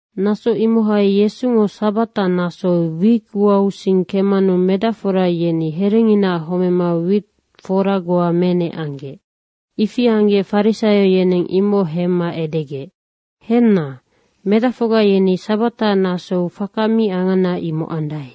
Naso imohai Yesungo sabata nasou wit uausing kemmanu medacfora yeni herenginaac homema wit fora goa menec anggec. Ifi anggec farisaio yeneng imoc hemma edegec, “Henna, medacfocga yeni sabata nasou faka mi angana, imoc andae.”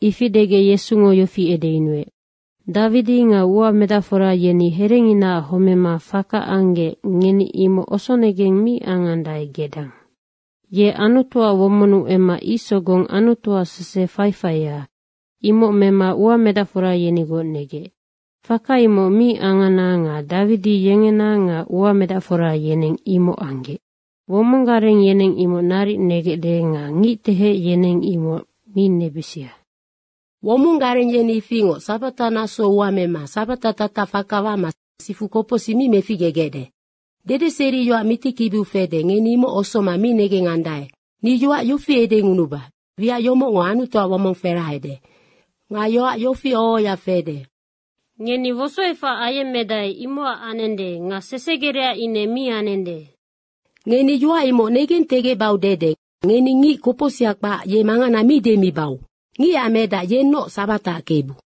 Ifi degec Yesungo yofi edeyunuec, “Dawidi nga uamedacfora yeni herenginaac homema faka anggec, ngeni imoc osonegeng mi angandae gedang. Ye Anutuac womonnu emma ic sogong Anutuac sese faifaia, imoc mema uamedacfora yenigoc negec. Faka imoc mi angana nga Dawidi yengena nga uamedacfora yeneng imoc anggec. Womong gareng yeneng imoc naric negecde nga ngictehec yeneng imoc mi nebisia. Womong gareng yeni ifingoc sabata nasou ua mema sabata tatac faka wama sifu kopocsic mi meficgegecde. Dedeseriyoac mitikibiu fede, ngeni imoc osoma mi negengandae. Ni yoac yofi edengunuba, wiac yomocngo Anutuac womong ferahade. Nga yoac yofi oho ohoya fede, ‘Ngeni wosoefac ayemmedae, imocac anende nga sesegerecac ine mi anende.’ Ngeni yoac imoc negentegecbau dede ngeni ngic kopocsiha kpac, ye mangana mi demibau. Ngicac Medac yennoc sabataac Kebu.”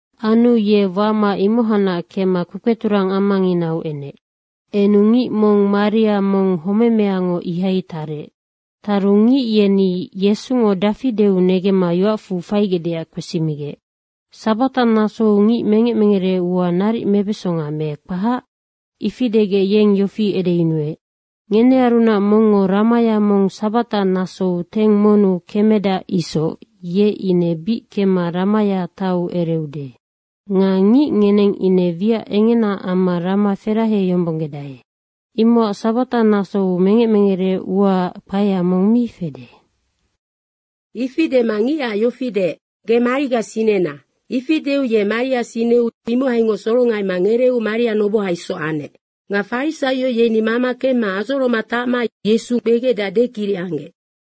Anu ye wama imohacnac kemma kpekpeturang amanginau enec. Enu ngic mong maria mong homemeango ihaingoc tarec. Taru ngic yeni Yesungo dafi deu negemma yoacfu faigecdeac kpesimigec, “Sabata nasou ngic mengec mengere ua naric mebesonga me kpac?” Ifi degec yeng yofi edeyunuec, “Ngenearunac mongngo ramaya mong sabata nasou teng monnu kemedac isoc, ye ine bic kemma ramaya taiu ereude. Nga ngic ngeneng ine wiac engena amma rama feraheyombonggedae. Imocac sabata nasou mengec mengere uaac kpaea mong mi fede.” Ifi dema ngicac yofi deec, “Ge mariga sinena.” Ifi deu ye maria sineu imohaingoc sorongaima ngereeu maria noboha isoc anec. Nga farisaio yeni mama kemma adzoroma tacma Yesu kpegecdeac dekiric anggec.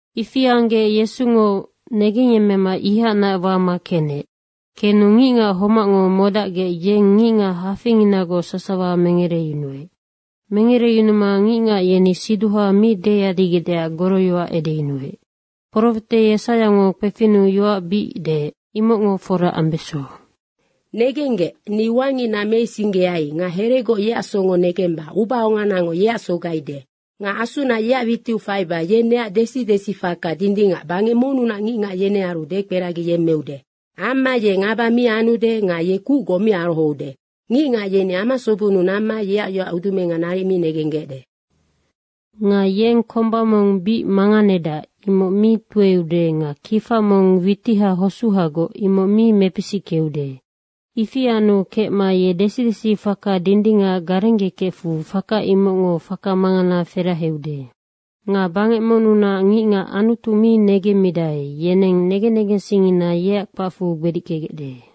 Ifi anggec Yesungo negengyemmema imohacnac wama kenec. Kenu ngicngac homacngo modacgec yeng ngicngac hafeinginagoc sasawa mengereyunuec. Mengereyunuma ngicngac yeni siduha mi deyadigecdeac goroyoac edeyunuec. Profete Yesaiango kpefinnu yoac bic deec, imoc fora ambeso, “Negenggec, ni ua ngicna meisinggeai nga heregoc yeac songo negemba ubaonganango yeac sogaide. Nga Asuna yeac witiu faiba yeng neac desi desifaka dindingac bangec monnunac ngicngac, yenearu dekperagiyemmeude. Amma ye ngaba mi anude nga ye kucgoc mi arohoude. Ngicngac yeni amasobennu namma yeac yoac udumenga naric mi negenggecde. Nga yeng komba mong bic manganedac, imoc mi tueude nga kifa mong witiha hosuhagoc, imoc mi mepisickeude. Ifi anu kecma ye desi desi faka dindingac garenggekefu faka imocngo faka mangana feraheude. Nga bangec monnunac ngicngac Anutu mi negendae, yeneng negen negensingngina yeac kpacfu gbedickegecde.”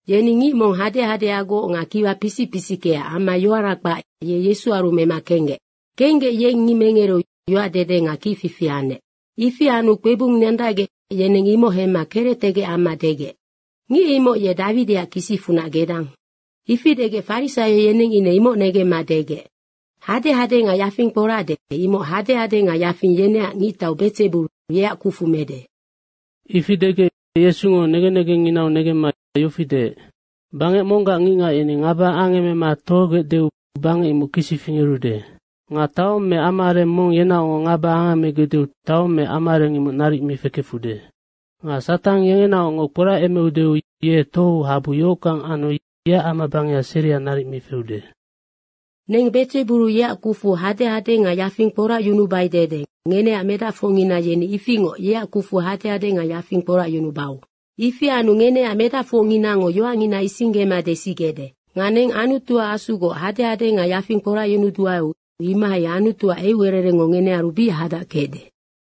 Yeni ngic mong hadehadeagoc nga kiwa pisic pisickea amma yoara kpac, ye Yesuaru mema kenggec. Kenggec yeng ngic mengereu yoac dede nga kicfifi anec. Ifi anu kpebung nandacgec, yeneng imoc hemma kerectegec amma degec, “Ngic imoc ye Dawidiac kisicfunac gedang.” Ifi degec Farisaio yeneng ine imoc negemma degec, “Hadehade nga yafing kporacde, imoc hadehade nga yafing yeneac ngictau Bedzeburu, yeac kucfu mede.” Ifi degec Yesungo negen negengnginau negemma yofi deec, “Bangec monggac ngicngac yeni ngaba angemema tohogecdeu bangec imoc kisi fingerude. Nga taong me amaareng mong yenaocngoc ngaba angemegecdeu taong me amaareng imoc naric mi fekefude. Nga Satang yengenaocngoc kporacemeudeu ye tohou habu yohockang anu yeac amabangeha seria naric mi feude. Neng Bedzeburu yeac kucfu hadehade nga yafing kporacyunubai dede ngeneac medacfocngina yeni ifingoc yeac kucfu hadehade nga yafing kporacyunubau. Ifi anu ngeneac medacfocnginango yoacngina isinggema desigecde. Nga neng Anutuac Asugoc hadehade nga yafing kporacyunuduaeu imohai Anutuac eucererengngo ngenearu bic hadac kecde.”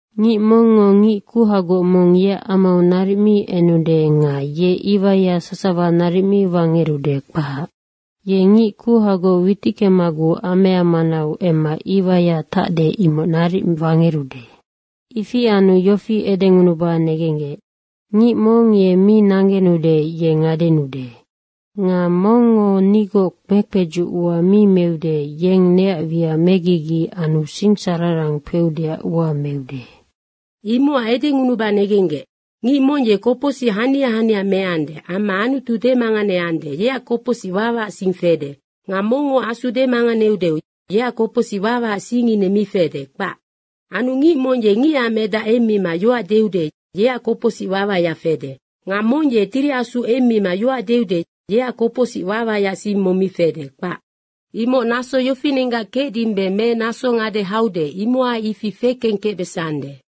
“Ngic mongngo ngic kuhagoc mong yeac amau naric mi enude nga ye iwaiya sasawa naric mi wangerude, kpac. Ye ngic kuhagoc witickemaguc amea manau emma iwaiya tacde, imoc naric wangerude.” “Ifi anu yofi edengunuba negenggec, ngic mong ye mi nanggenude ye ngadenuude. Nga mongngo nigoc mekpedzuc ua mi meude, yeng neac wiac megigi anu sinsararang kpeudeac ua meude. Imocac edengunuba negenggec, ngic mong ye kopocsic hania hania meande amma Anutu demanganeande, yeac kopocsic wawaac sing fede. Nga mongngo Asu demanganeude, yeac kopocsic wawaac sing ine mi fede, kpac. Anu ngic mong ye Ngicac Medac emmima yoac deude, yeac kopocsic wawaya fede. Nga mong ye Tiri Asu emmima yoac deude, yeac kopocsic wawaac sing mong mi fede, kpac. Imoc naso yofinenggac kecdimbe me naso ngade haude, imohai ifi fekeng kecbesande.”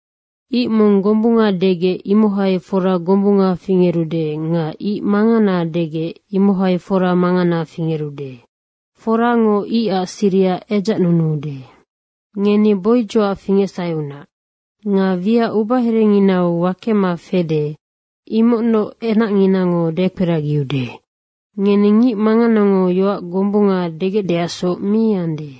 “Ic mong gombunga degec, imohai fora gombunga fingerude nga ic mangana degec, imohai fora mangana fingerude. Forango icac siriha edzacnunuude. Ngeni boidzocac fingecsaheunac. Nga wiac ubaherenginau wakema fede, imocnoc enacnginango dekperagiude. Ngeni ngic manganango yoac gombunga degecdeacsoc mi ande.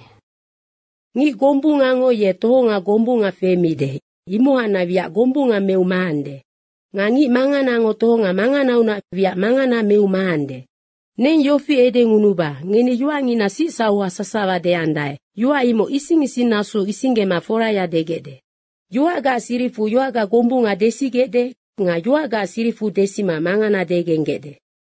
Ngic gombungango ye tohonga gombunga femide, imohacnac wiac gombunga meu maande. Nga ngic manganango tohonga manganaunac wiac mangana meu maande. Neng yofi edengunuba, ngeni yoacngina sicsauha sasawa deandae, yoac imoc ising ising nasou isinggema foraya degecde. Yoacgaac siricfu yoacga gombunga desigecde nga yoacgaac siricfu desima mangana degenggecde.”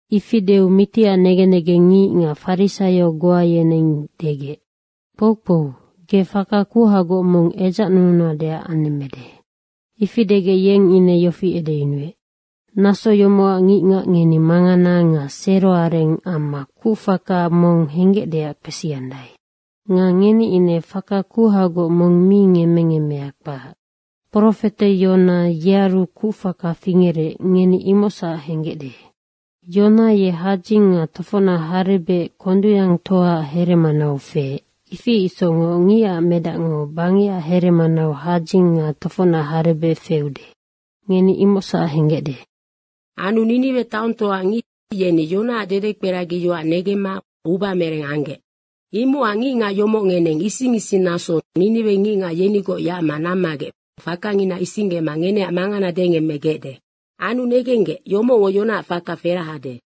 Ifi deu mitiac negen negengngic nga farisaio goa yeneng degec, “Kpoukpou, ge faka kuhagoc mong edzacnununadeac anemmede.” Ifi degec yeng ine yofi edeyunuec, “Naso yomocac ngicngac ngeni mangana nga seroareng amma kucfaka mong henggecdeac kpesiandae. Nga ngeni ine faka kuhagoc mong mi ngemmengemmea, kpac. Profete Yona, yearu kucfaka fingerec, ngeni imocsac henggecde. Yona ye hadzing nga tofocnac harebec kondungyangtoaac heremanau feec, ifi isocngoc Ngicac Medacngo bangecac heremanau hadzing nga tofocnac harebec feude, ngeni imocsac henggecde. Anu Niniwe taongtoaac ngic yeni Yonaac dedekperagiyoac negemma ubamereng anggec. Imocac ngicngac yomoc ngeneng ising ising nasou Niniwe ngicngac yenigoc yacma nammagec fakangina isinggema ngeneac mangana dengemmegecde. Anu negenggec, yomocngo Yonaac faka ferahade.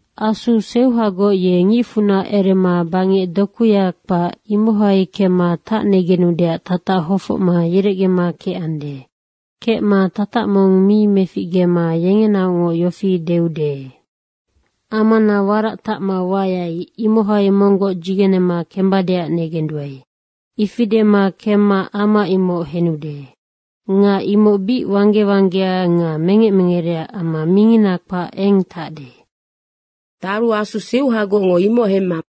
Asu seuhagoc ye ngicfunac erema bangec dokuya kpac, ihai kemma tacnegenudeac tatac hofocma yerecgema kecande. Kecma tatac mong mi meficgema yengenaocngoc yofi deude, ‘Amana warac tacma wayai, imohai monggoc dzigenema kembadeac negenduae.’ Ifi dema kemma ama imoc henude. Nga imoc bic wangge wanggea nga mengec mengerea amma mingina kpac eng tacde. Taru asu seuhagocngo imoc hemma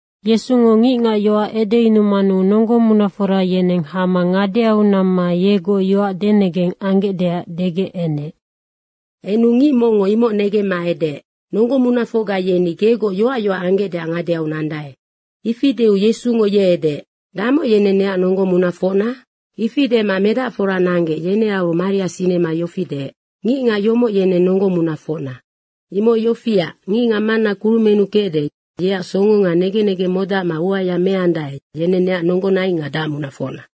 Yesungo ngicngac yoac edeyunumanu nonggo munafora yeneng hama ngadeau namma yegoc yoac denegeng anggecdeac degec enec. Enu ngic mongngo imoc negemma edeec, “Nonggo munafocga yeni gegoc yoac yoac anggecdeac ngadeau nandae.” Ifi deu Yesungo ye edeec, “Damoc yeneng neac nonggo munafocna?” Ifi dema medacfora nanggec, yenearu maria sinema yofi deec, “Ngicngac yomoc yeneng nonggo munafocna. Imoc yofiac, ngicngac Manna kurumennu kecde, yeac songo nga negen negeng modacma uaya meandae, yenennoc neac nonggonaing nga dacmunafocna.”